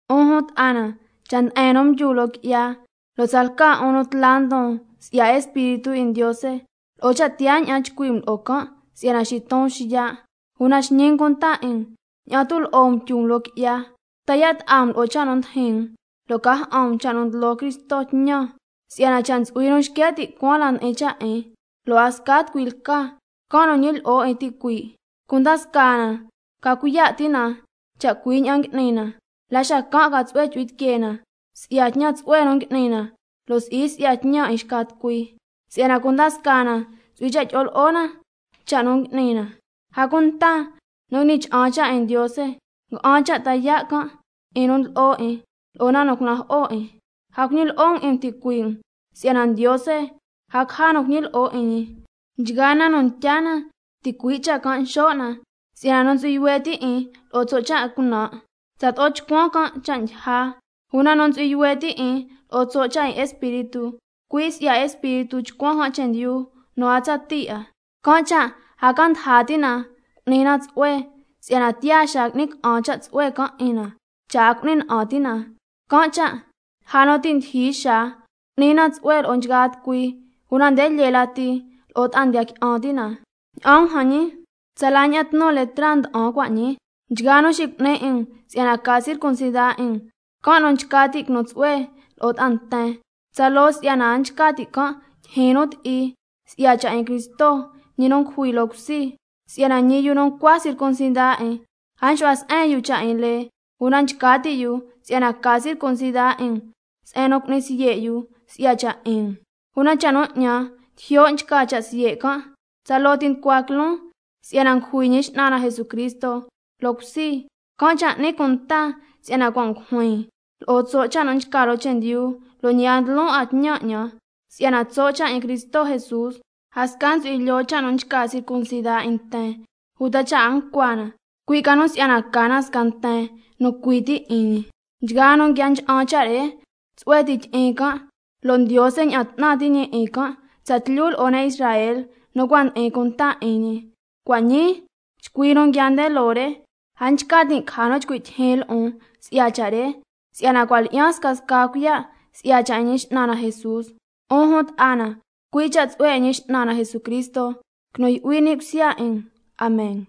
'Un jun ta'a na, cha' nde'en nu mdyu loo qui'ya, lo' tsalca 'un nu tla ndon si'ya Espíritu 'in Ndiose, lo'o suun ña'an chcui' um lo'o can' si'yana xiton xiya', una xñi um cunta 'in um ña'an tu' lo'o um tyu um loo qui'ya. Ta yaa' ta'a um lo'o cha' nu ndijin um, lo' cuaña'an tucua um tñan cha' nu ndlo Cristo tñan. Si'yana cha' ntsu'hui nu xque' ti' cuaan la ndi'in cha' 'in, lo' a sca tucui lca, can' nu ñilyi'o 'in ticuii'. Cunda scaa na ca cuiya' ti' na cha' cui' ña'an ngui'ni na, la xacan' ca tsu'hue chu'hui tiquee na si'ya tñan tsu'hue nu ngui'ni na, lo' si'i si'ya tñan 'in xca tucui, si'yana cunda scaa na ntsu'hui cha' tyi'o lo'o na cha' nu ngui'ni na. A cunta nu ngui'ni cha'an cha' 'in Ndiose, nga'an cha' ta yaa' can' 'in nu ndlo'o 'in lo'o na nu cunajo'o 'in. A cuñilyi'o um 'in um ticuii' um, si'yana Ndiose a caja nu cuiñi lyi'o 'in ñi: Nchgaa na nu ntya na, ticui' cha' can' xo' na. Si'yana nu ntsu'hui yuhue ti' 'in lo'o tso' cha' 'in cunan', tsato'o chcuan can' cha' ndyija, una nu ntsu'hui yuhue ti' 'in lo'o tso' cha' 'in Espíritu, cui' si'ya Espíritu chcuan can' chendyu nu a tsatii 'a. Can' cha' a ca ndaja ti' na cu'ni na tsu'hue, si'yana tiyaa xaa qui'ni ca'an cha' tsu'hue can' 'in na, cha' a cu'ni na'an ti' na lo'o cha' re. Can' cha' lja nu ti' ndyijyi xaa, cu'ni na tsu'hue lo'o nchgaa tucui, una nde lyee lati lo'o ta'a ndiya qui'an ti' na. Ña'an um jan ñi, tsala ña'an tnu letra nda'an cua' ñii. Nchgaa nu xicu'ni 'in um si'yana ca circuncida 'in um, can' nu nchca ti' quinu tsu'hue lo'o ta'a nten, tsaloo si'yana a nchca ti' can' tyijyin nu ti'i si'ya cha' 'in Cristo, ñi nu ngujui loo cusi. Si'yana ñi yu nu ncua circuncida 'in a nxu'hua se'en yu cha' 'in lee, una nchca ti' yu si'yana ca circuncida 'in um, se'en nu cu'ni siye' yu si'ya cha' 'in um. Una cha' nu 'ñan tijyo' nchca cha' siye' can', tsaloo ti nducua quiloon si'yana ngujui Ñi X'nan na Jesucristo loo cusi, can' cha' n'nin cunta si'yana cua' ngujuin lo'o tso' cha' nu nchca loo chendyu, lo' ñi a ndlo 'a na tñan 'ñan. Si'yana tso' cha' 'in Cristo Jesús, a sca ntsu'hui lyoo cha' nu nchca circuncida 'in nten uta cha' a ncua na, cui' ca nu si'yana ca na sca nten nu cui ti 'in ñi. Nchgaa nu nguia ncha'an cha' re, tsu'hue ti tyi'in can', lo' Ndiose ña'an 'tnan ti' ñi 'in tsatlyu lo'o ne' Israel nu cua' ndi'in cunta 'in ñi. Can' cha' cua' ñii chcui nu nguiaa nde loo re, a nchca tin' caja nu chcui' tyijyin lo'on si'ya cha' re, si'yana cua' lyi'yan scasca cuiya' si'ya cha' 'in Ñi X'nan na Jesús. 'Un jun ta'a na, cui' cha' tsu'hue 'in Ñi X'nan na Jesucristo quinu yu'hui ni' cusya 'in um. Amen.